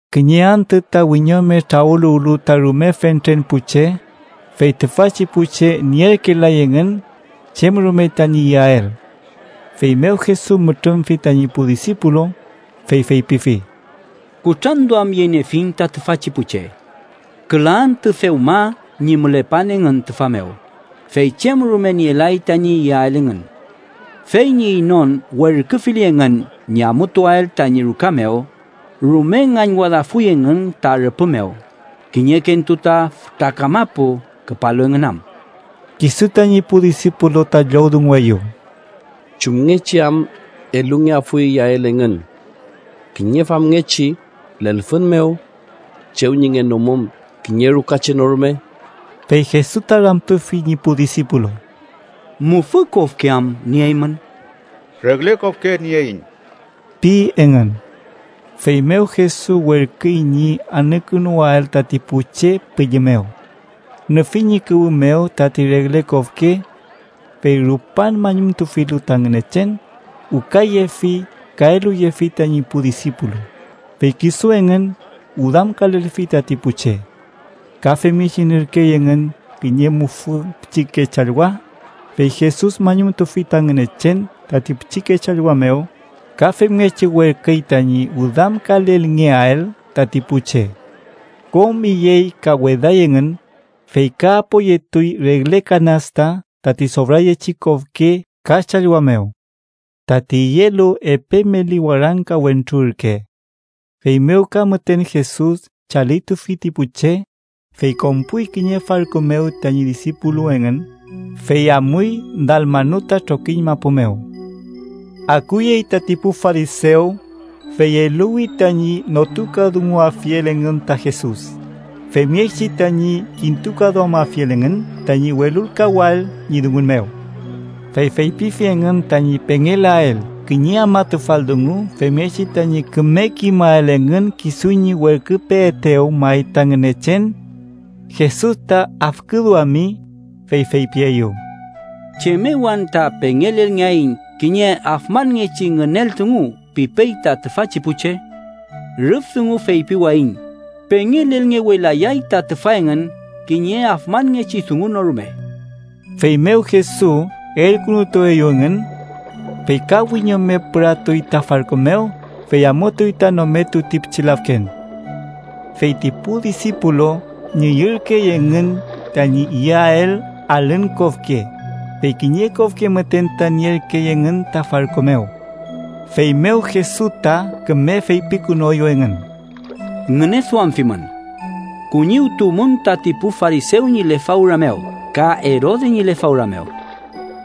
Kiñe antü ta wiñome trawüluwlu ta rume fentren pu che, fey tüfachi pu che nierkelay engün chem rume tañi iyael. Feymew Jesus mütrümfi tañi pu disipulu, fey feypifi: —Kutranduamyeniefiñ ta tüfachi pu che. Küla antü dewma ñi mülepan engün tüfa mew, fey chem rume nielay tañi iyael engün. Fey ñi inon werküfili engün ñi amutuael tañi ruka mew, rume ngañwadafuy engün ta rüpü mew, kiñekentu ta fütra kamapu küpalu engün am. Kisu tañi pu disipulu ta llowdungueyew: —¿Chumngechi am elungeafuy iyael engün kiñe famngechi lelfün mew, chew ñi ngenomum kiñe ruka che no rume? Fey Jesus ta ramtufi ñi pu disipulu: —¿Mufü kofke am nieymün? —Regle kofke nieiñ ―pi engün. Feymew Jesus werküy ñi anükünuwael tati pu che pülli mew. Nüfi ñi kuwü mew tati regle kofke. Fey rupan mañumtufilu ta Ngünechen, wükayefi ka eluyefi tañi pu disipulu, fey kisu engün wüdamkalelfi tati pu che. Ka femngechi nierkey engün kiñe mufü pichike challwa, fey Jesus mañumtufi ta Ngünechen tati pichike challwa mew, ka femngechi werküy tañi wüdamkalelngeael tati pu che. Kom iyey ka weday engün, fey ka apoyetuy regle kanasta tati sofrayechi kofke ka challwa mew. Tati iyelu epe meli warangka wentru ürke. Feymew ka müten Jesus chalitufi ti pu che, fey konpuy kiñe farku mew tañi disipulu engün, fey amuy Dalmanuta trokiñ mapu mew. Akuyey tati pu farisew, fey eluwi tañi notukadunguafiel engün ta Jesus, femngechi tañi kintukaduamafiel engün tañi welulkawael ñi dungun mew. Fey feypifi engün tañi pengelael kiñe afmatufal dungu femngechi tañi küme kimael engün kisu ñi werküpeetew may ta Ngünechen. Jesus ta afküduami, fey feypieyew: —¿Chem mew anta pengelelngeaiñ kiñe afmanngechi ngünel dungu pipey ta tüfachi pu che? Rüf dungu feypiwayiñ, pengelelngewelayay ta tüfa engün kiñe afmanngechi dungu no rume. Feymew Jesus elkünutueyew engün, fey ka wiñome püratuy ta farku mew, fey amutuy ta nometu ti pichi lafken. Fey ti pu disipulu ngüyürkey engün tañi yeael alün kofke, fey kiñe kofke müten ta nierkey engün ta farku mew. Feymew Jesus ta küme feypikünueyew engün: —Ngüneduamfimün. Kuñiwtuwmün tati pu farisew ñi lefawra mew ka Erode ñi lefawra mew.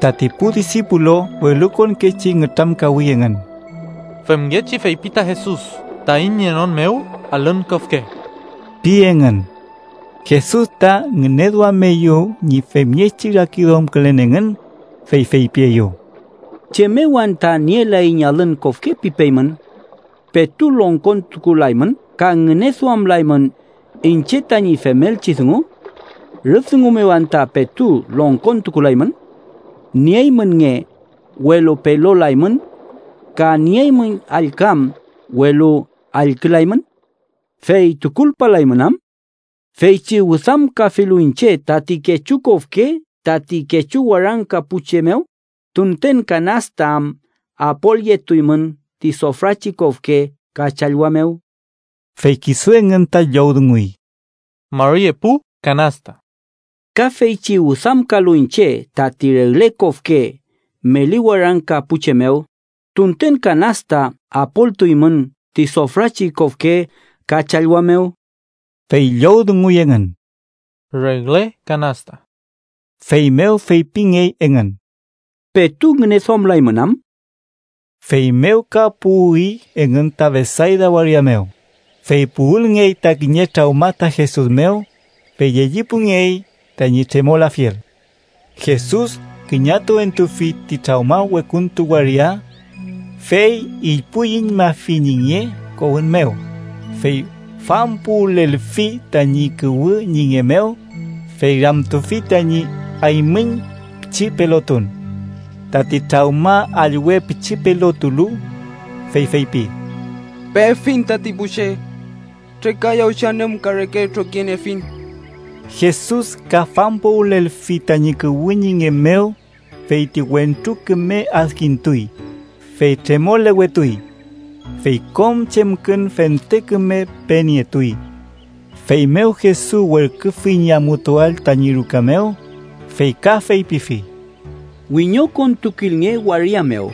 Tati pu disipulu welukonkechi nütramkawi engün: “femngechi feypi ta Jesus taiñ nienon mew alün kofke” pi engün. Jesus ta ngüneduameyew ñi femngechi rakiduamkülen engün, fey feypieyew: —¿Chem mew anta ‘nielaiñ alün kofke’ pipeymün? ¿Petu longkontukulaymün ka ngüneduamlaymün iñche tañi femelchi dungu? ¿Rüf dungu mew anta petu longkontukulaymün? ¿Nieymün nge, welu pelolaymün, ka nieymün allküam, welu allkülaymün? ¿Fey tukulpalaymün am? Feychi wüdamkafilu iñche tati kechu kofke tati kechu warangka pu che mew, ¿tunten kanasta am apolyetuymün ti sofrachi kofke ka challwa mew? Fey kisu engün ta llowdunguy: —Mari epu kanasta. —Ka feychi wüdamkalu iñche tati regle kofke meli warangka pu che mew, ¿tunten kanasta apoltuymün ti sofrachi kofke ka challwa mew? Fey llowdunguy engün: —Regle kanasta. Feymew feypingey engün: —¿Petu anta ngüneduamlaymün? Feymew ka puwi engün ta Betsayda waria mew, fey puwülelngey ta kiñe trawma ta Jesus mew, fey llellipungey tañi tremolafiel. Jesus küñatuentufi ti trawma wekuntu waria. Fey ilpuyüñmafi ñi nge kowün mew, fey fampuwülelfi tañi kuwü ñi nge mew, fey ramtufi tañi aymüñ pichi pelotun. Tati trawma allwe pichi pelotulu, fey feypi: —Pefiñ tati pu che. Trekayawchi anümka reke trokiniefiñ. Jesus ka fampuwülelfi tañi kuwü ñi nge mew, fey ti wentru küme adkintuy, fey tremolewetuy. Fey kom chemkün fente küme penietuy. Feymew Jesus werküfi ñi amutuael tañi ruka mew, fey ka feypifi: —Wiñokontukilnge waria mew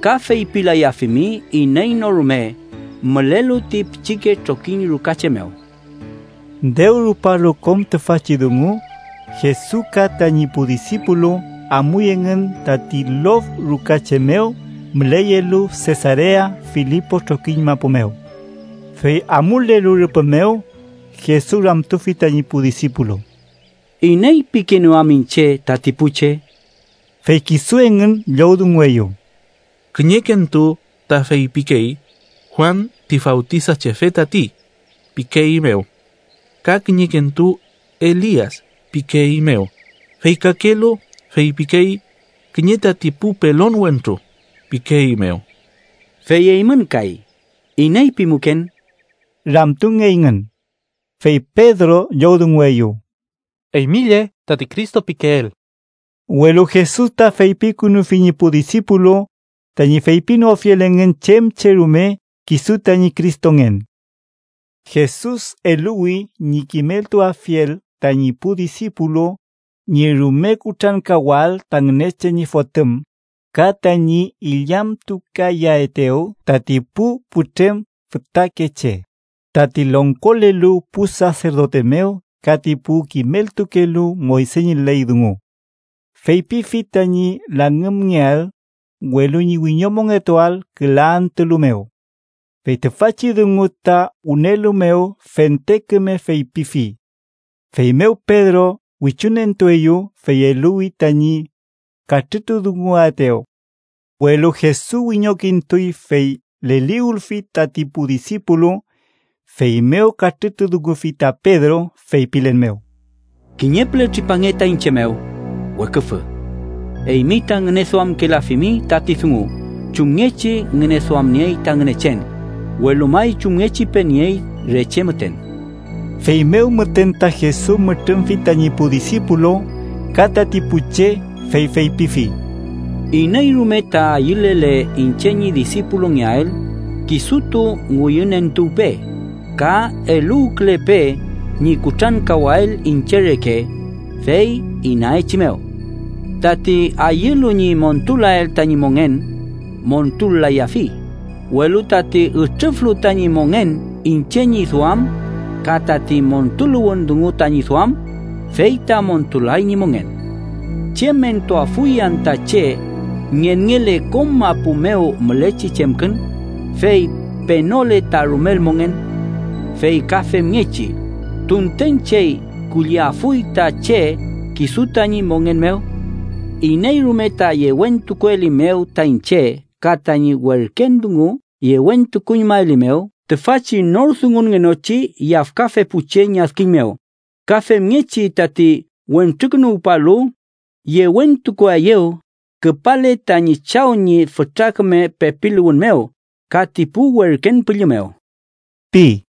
ka feypilayafimi iney no rume mülelu ti pichike trokiñ ruka che mew. Dew rupalu kom tüfachi dungu, Jesus ka tañi pu disipulu amuy engün tati lof ruka che mew müleyelu Sesarea Filipo trokiñ mapu mew. Fey amulelu rüpü mew, Jesus ramtufi tañi pu disipulu: —¿Iney pikeenew am iñche tati pu che? Fey kisu engün llowdungueyew: —Kiñekentu ta feypikey ‘Juan ti Fawtisachefe tati’ pikeeymew, ka kiñekentu ‘Elias’ pikeeymew, fey kakelu feypikey ‘kiñe tati pu pelon wentru’ pikeeymew. —Fey eymün kay, ¿iney pimuken? ―ramtungeyngün. Fey Pedro llowdungueyew: —Eymi lle tati Cristo pikeel. Welu Jesus ta feypikünufi ñi pu disipulu tañi feypinoafiel engün chem che rume kisu tañi Cristongen. Jesus eluwi ñi kimeltuafiel tañi pu disipulu ñi rume kutrankawael ta Ngünechen ñi Fotüm, ka tañi illamtukayaetew tati pu putrem fütakeche, tati longkolelu pu saserdote mew ka ti pu kimeltukelu Moyse ñi ley dungu. Feypifi tañi langümngeael, welu ñi wiñomongetuael küla antüalu mew. Fey tüfachi dungu ta wünelu mew fente küme feypifi. Feymew Pedro wichunentueyew, fey eluwi tañi katrütudunguaetew. Welu Jesus wiñokintuy, fey leliwülfi tati pu disipulu, feymew katrütudungufi ta Pedro, feypilen mew: —¡Kiñe püle tripange ta iñche mew, weküfü! Eymi ta ngüneduamkelafimi tati dungu chumngechi ngüneduamniey ta Ngünechen, welu may chumngechi peniey re che müten. Feymew müten ta Jesus mütrümfi tañi pu disipulu ka tati pu che, fey feypifi: —Iney rume ta ayülele iñche ñi disipulungeael, kisutu ngüyünentuwpe, ka eluwkülepe ñi kutrankawael iñche reke, fey inaechimew. Tati ayülu ñi montulael tañi mongen, montul-layafi, welu tati ütrüflu tañi mongen iñche ñi duam ka tati montuluwün dungu tañi duam, fey ta montulay ñi mongen. ¿Chem entuafuy anta che ngenngele kom mapu mew mülechi chemkün, fey penole ta rumel mongen? Fey ka femngechi, ¿tunten chey kulliafuy ta che kisu tañi mongen mew? Iney rume ta yewentukuelimew ta iñche ka tañi werken dungu yewentukuñmaelimew tüfachi nor dungungenochi yafkafe pu che ñi adkiñ mew, ka femngechi tati Wentrukünuwpalu yewentukuaeyew küpale tañi Chaw ñi fütra küme pepiluwün mew ka ti pu werken püllü mew ―pi.